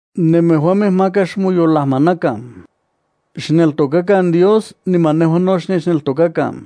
’Nemejuamej maka xmoyolajmanakan. Xneltokakan Dios niman nejua no xnechneltokakan.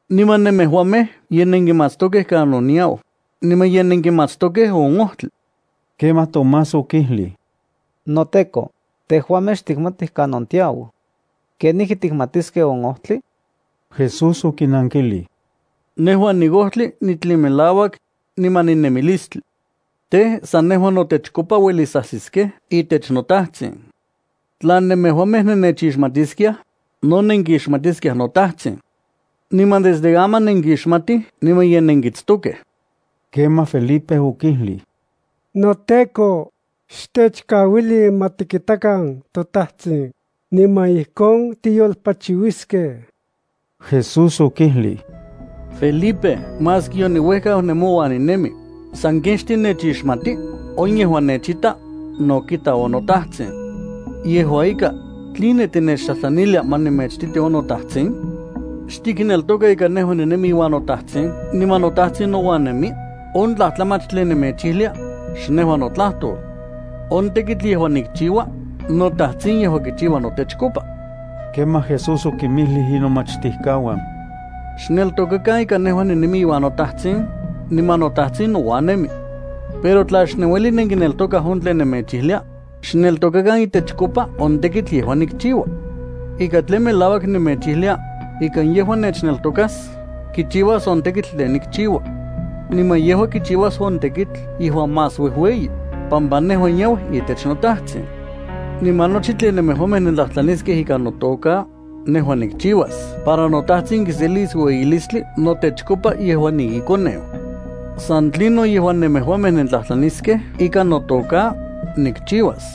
Niman nemejuamej ye nenkimatstokej kanon niau, niman ye nenkixmatstokej on ojtli. Kemaj Tomás okijlij: —NoTEKO, tejuamej xtikmatij kanon tiau. ¿Kenijki tikixmatiskej on ojtli? Jesús okinankilij: —Nejua niojtli, nitlin melauak, niman ninemilistli. Tej, san nejua notechkopa uelis ajsiskej itech noTajtsin. Tla nemejuamej nennechixmatiskiaj, no nenkixmatiskiaj noTajtsin. Niman desde aman nenkixmatij niman ye nenkitstokej. Kemaj Felipe okijlij: —NoTEKO, xtechkauili ma tikitakan toTajtsin, niman ijkon tiyolpachiuiskej. Jesús okijlij: —Felipe, maski yoniuejkau nemouan ninemi, ¿sanken xtinechixmati? On yejuan nechita, no kita on noTajtsin. Yejua ika, ¿tline tinechtlajtlanilia ma nemechititi on noTajtli? ¿Xtikneltoka ika nejua ninemi iuan noTajtsin niman noTajtsin nouan nemi? On tlajtlamach tlen nemechijlia, xnejua notlajtol. On tekitl yejuan nikchiua, noTajtsin yejua kichiua notechkopa. Kemaj Jesús okinmijlij inomachtijkauan: —Xneltokakan ika nejua ninemi iuan noTajtsin, niman noTajtsin nouan nemi. Pero tla xnenuelij nenkineltokaj on tlen nemechijlia, xneltokakan itechkopa on tekitl yejuan nikchiua. Ika tlen melauak nemechijlia, ika yejuan nechneltokas kichiuas on tekitl tlen nikchiua. Niman yejua kichiuas on tekitl yejuan más uejueyi, pampa nejua niau itech noTajtsin. Niman nochi tlen nemejuamej nentlajtlaniskej ikan notoka, nejua nikchiuas para noTajtsin kiselis ueyilistli notechkopa yejuan niiKoneu. San tlinon yejuan nemejuamej nentlajtlaniskej ikan notoka, nikchiuas.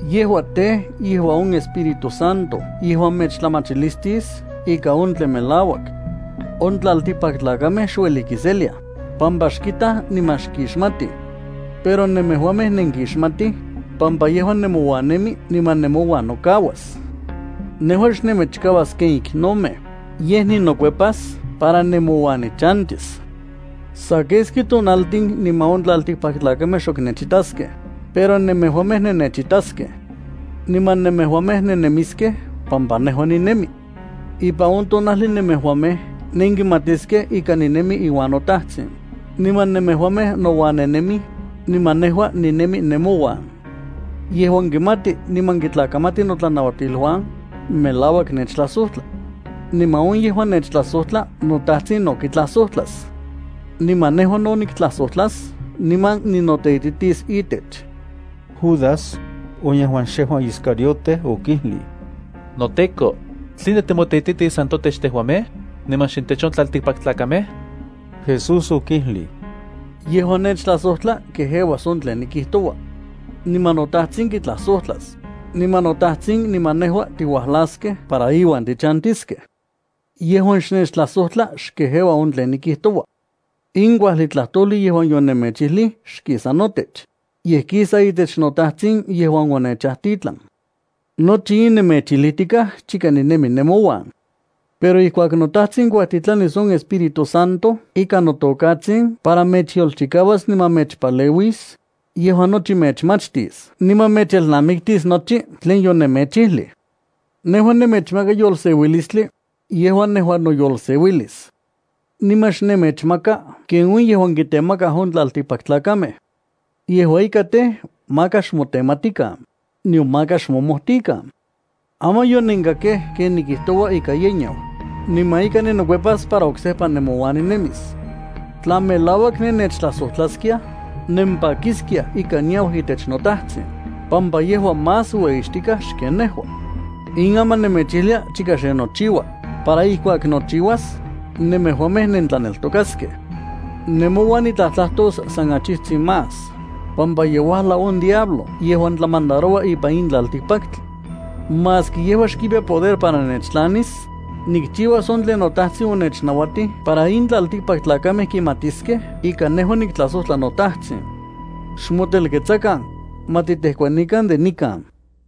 Yejua tej, on Espíritu Santo yejuan mechtlamachilistis ika on tlen melauak. On tlaltikpaktlakamej xuelij kiseliaj, pampa xkitaj niman xkixmatij. Pero nemejuamej nenkixmatij, pampa yejua nemouan nemi niman nemouan nokauas. Nejua xnemechkauas ken iknomej, yej ninokuepas para nemouan nichantis. Sa keski tonaltin niman on tlaltikpaktlakamej xok nechitaskej, pero nemejuamej nennechitaskej. Niman nemejuamej nennemiskej pampa nejua ninemi. Ipan on tonajli nemejuamej nenkimatiskej ika ninemi iuan noTajtsin, niman nemejuamej nouan nennemij, niman nejua ninemi nemouan. Yejuan kimati niman kitlakamati notlanauatiluan, melauak nechtlajsojtla. Niman on yejuan nechtlajsojtla noTajtsin no kitlajsojtlas. Niman nejua no niktlajsojtlas niman ninoteititis itech. Judas, on yejuan xejua Iscariote, okijlij: —NoTEKO, ¿tline timoteititis san totech tejuamej, niman xintech on tlaltikpaktlakamej? Jesús okijlij: —Yejuan nechtlajsojtla kejeuas on tlen nikijtoua. Niman noTajtsin kitlajsojtlas, niman noTajtsin niman nejua tiuajlaskej para iuan tichantiskej. Yejuan xnechtlajsojtla xkejeua on tlen nikijtoua. In kuajli tlajtojli yejuan yonemechijlij xkisa notech, yej kisa itech noTajtsin yejuan onechajtitlan. ’Nochi in nemechijlijtikaj chika ninemi nemouan. Pero ijkuak noTajtsin kuajtitlanis on Espíritu Santo ikan notokatsin para mechyolchikauas niman mechpaleuis, yejua nochi mechmachtis niman mechelnamiktis nochi tlen yonemechijlij. ’Nejua nemechmaka yolseuilistli yejuan nejua noyoseuilis. Niman xnemechmaka ken on yejuan kitemakaj on tlaltikpaktlakamej. Yejua ika tej, maka xmotenmatikan, nion maka xmomojtikan. Aman yonenkakej ken nikijtoua ika ye niau, niman ika ninokuepas para oksejpa nemouan ninemis. Tla melauak nennechtlajsojtlaskiaj, nempakiskiaj ika niau itech noTajtsin, pampa yejua más ueyixtikaj xken nejua. In aman nemechijlia chika xe nochiua, para ijkuak nochiuas, nemejuamej nentlaneltokaskej. ’Nemouan nitlajtlajtos sa achijtsin más, pampa ye uajlau on diablo yejuan tlamandaroua ipan in tlaltikpaktli. Maski yejua xkipiya poder para nechtlanis, nikchiuas on tlen noTajtsin onechnauatij para in tlaltikpaktlakamej kimatiskej ika nejua niktlajsojtla noTajtsin. Xmotelketsakan, ma titejkuanikan de nikan.